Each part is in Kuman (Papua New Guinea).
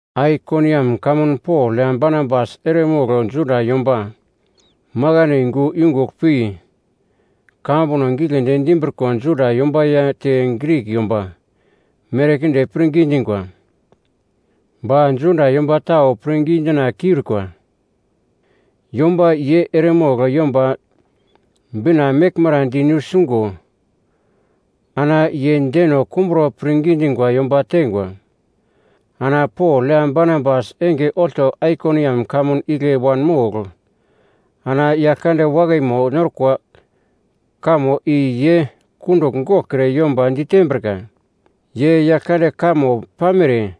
Aikoniam kamun Pol ya Barnabas eremogl Juda yomba makaino yungu yungugl pi kamambuno giglendi dimbriko Juda yomba ya te Grik yomba merkinde pirngi dingwa. Ba Juda yomba tau pirngi dina kiurikwa yomba ye eremogl Yomba Bina meglmara di nusingo ana ye deno kumbro pirngi dingwa yomba teingwa. Ana Pol ya Barnabas enge olto Aikoniam kamun igle wanmogl ana Yaglkande wakaimo norkwa kamo i ye kundugl goglkre yomba ditembrika. Ye Yaglkande kamo pamere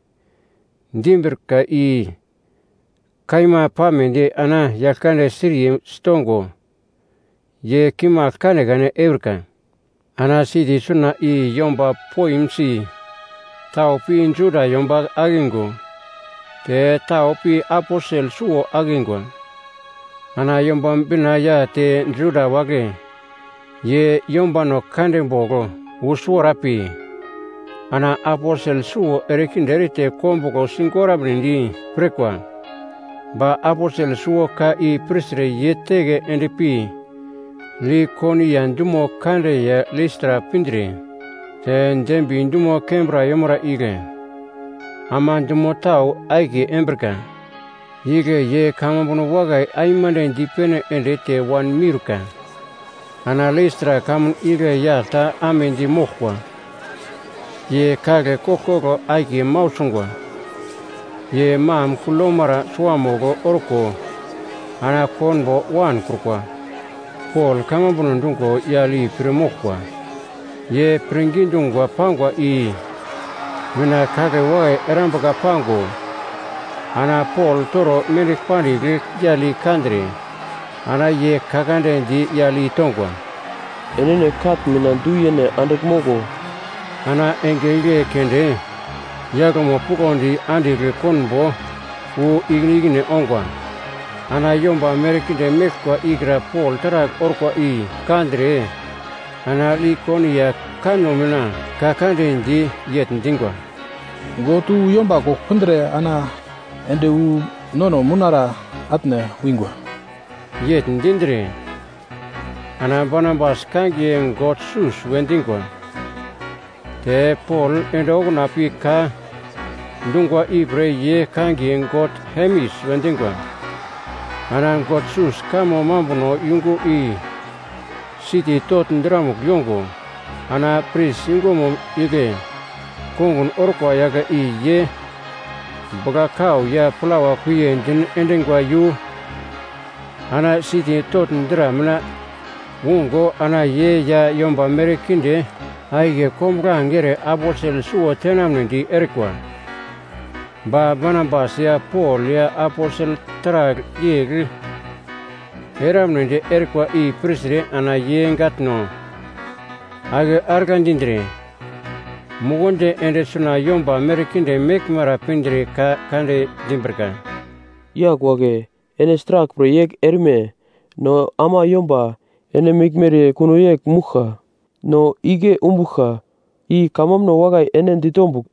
dimbrika i kaima pamedi ana Yaglkande siriye sitongo, ye kimagl kanekane eurika. Ana siti suna i yomba poimsi tau pi Juda yomba akingo te tau pi aposel suwo akingwa. Ana Yomba Bina ya te Juda wagle ye yombano kande bogl wu suwara pi, ana aposel suwo erekinde erete kombuglo sigoramnedi pirkwa. Ba aposel suwo ka i pirtre ye teke endpi Likonia dumo kande ya Listra pindre te Derbi dumo kembra yemara igle ama dumo tau akiye embrika. Igle ye kamambuno wakai aimande dipene ende te wanmiurka. Ana Listra kamun igle yagl ta amedi moglkwa, ye kagle koglkoglo akiye mau sungwa. Ye mam kugl yomara suamugl orko ana konbo wankrukwa. Pol kamambuno dungo yagl i pir moglkwa. Ye pirngi dungwa pangwa i mina kagle wakai erambuka pango, ana Pol toro mendigl pandigl yagl i kandre, ana ye ka kande di yagl i tongwa, “Enene katn mina du yene andigl moglo!” Ana enge igle keunde yaglmo puglondi andigl konbo wu ikine ikine ongwa. Ana yomba merkinde meglkwa ikra Pol taragl orkwa i kandre, ana Likonia kanno mina ka kande di yegl dingwa, “God wu yomba kogl pindre ana ende wu nono mounara atne wingwa.” Yegl dindre, ana Barnabas kangiye god Sus we dingwa, te Pol ende okuna pi ka dungwa ipre ye kangiye god Hermes we dingwa. Ana god Sus kamo mambuno yungu i siti togl dramugl yongo, ana pris yungumo igle kongun orkwa yagle i ye bugla-kau ya plawa kuiye din endingwa iyu, ana siti togl dra mina ungo ana ye ya yomba merkinde akiye kombuglange ere aposel suwo tenamnedi erikwa. Ba Barnabas ya Pol ya aposel taragl yegl eramnedi erikwa i pirtre ana ye gatno ake argla dindre, mukundi ende suna yomba merkinde meglmara pindre ka kande dimbrika, “Yagl wagle, ene sraglpre yegl erme? No ama yomba ene meglmere kuno yegl mouglka! No igle umbuglka i kamambuno wakai ene ditombugl,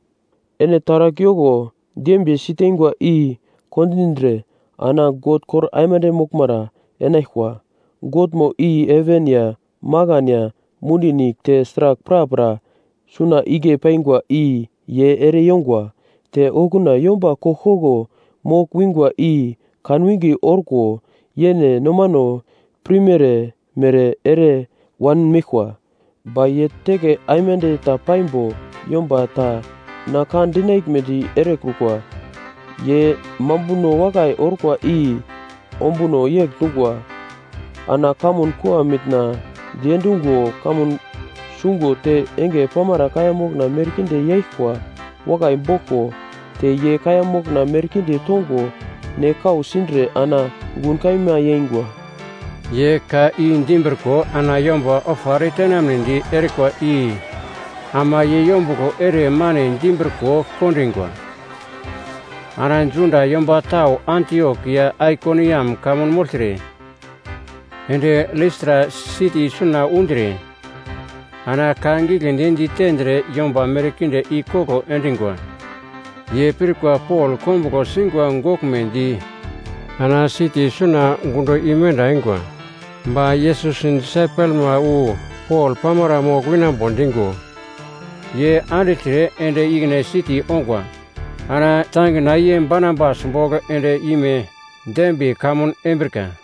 ene taragl yoko dembiye siteingwa i kondindre ana God kor aimande moglmara enaglkwa. Godmo i heven ya makan ya mundi nigl te sragl prapra suna igle paingwa i ye ere yongwa. Te okuna yomba koglkoglo mogl wingwa i kanwinge orko yene nomano pirmere-mere ere wanmeglkwa. Ba ye teke aimande ta paimbo yomba ta na ka dinaglmedi erekrukwa. Ye mambuno wakai orkwa i ombuno yegl dungwa. Ana kamun kua mitna diendungo kamun sungo te enge pamara kaiya mokna merkinde yaglkwa wakai boglko, te ye kaiya mokna merkinde tongo ne kau sindre ana gun kaima yeingwa.” Ye ka i dimbriko ana yomba ofa eretenamnedi erikwa i ama ye yombuglo ere mane dimbriko kondingwa. Ana Juda yomba tau Antiok ya Aikoniam kamun mogltre, ende Listra siti suna undre ana ka giglendi ditendre yomba merkinde ikoglo endingwa. Ye pirkwa Pol kombuglo singwa goglmedi ana siti suna gundo imenda eingwa. Ba Yesus disaipelma wu Pol pamara mogl winambo dingo, ye andigltre ende ikine siti ongwa. Ana tangina ye Barnabas bogl end-ime Derbi kamun embrika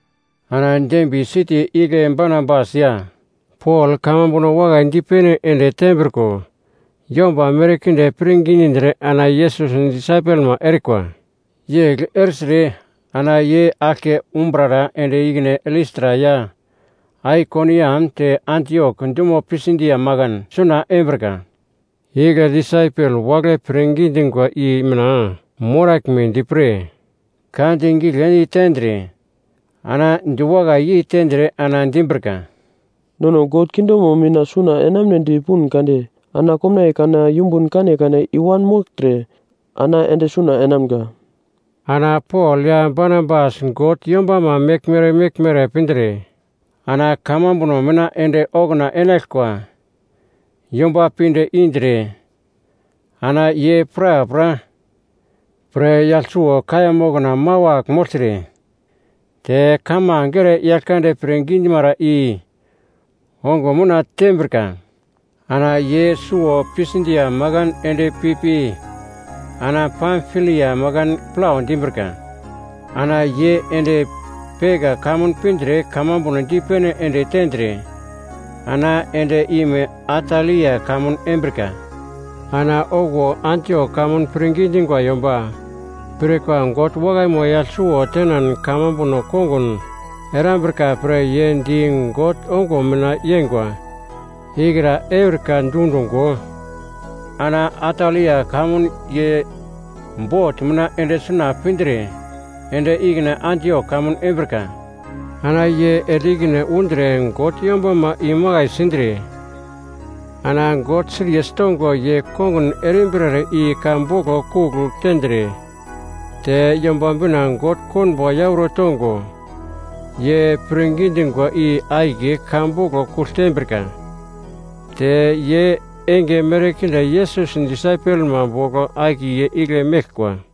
Ana Derbi siti igle Barnabas ya Pol kamambuno wakai dipene ende tembriko yomba merkinde pirngi dindre ana Yesus disaipelma erikwa. Yegl ertre ana ye aglke umbrara ende ikine Listra ya Aikoniam te Antiok dumo Pisidia makan suna embrika. Igle disaipel wagle pirngi dingwa i mina moraglmedi pre ka di giglendi tendre ana diwakai yei tendre ana dimbrika, “Nono God kingdomo mina suna enamunedi pun kade, ana komnaiye kana yumbun kanekane i-wanmogltre, ana ende suna enamga.” Ana Pol ya Barnabas God yombama meglmere meglmere pindre, ana kamambuno mina ende okuna enaglkwa yomba pinde indre ana ye prapra pre yagl suwo kaiya mokna mawagl mogltre, te kamange ere Yaglkande pirngi dimara i ongo mina tembrika. Ana ye suwo Pisidia makan ende pipi ana Pamfilia makan plau dimbrika. Ana ye ende Perga kamun pindre kamambuno dipene ende tendre, ana ende ime Atalia kamun embrika. Ana okuwo Antiok kamun pirngi dingwa yomba pirkwa God wakaimo yagl suwo tenan kamambuno kongun erambrika pre ye di God ongo mina yengwa ikra eurika dundungo, ana Atalia kamun ye bot mina ende suna pindre ende ikine Antiok kamun embrika. Ana ye ende ikine undre God yombama imakai sindre, ana God siriye sitongo ye kongun erimbrere i ka boglo kugl tendre, te Yomba Bina God konbo yauro tongo ye pirngi dingwa i akiye ka boglo kugl tembrika. Te ye enge merkinde Yesus disaipelma bogl akiye igle meglkwa.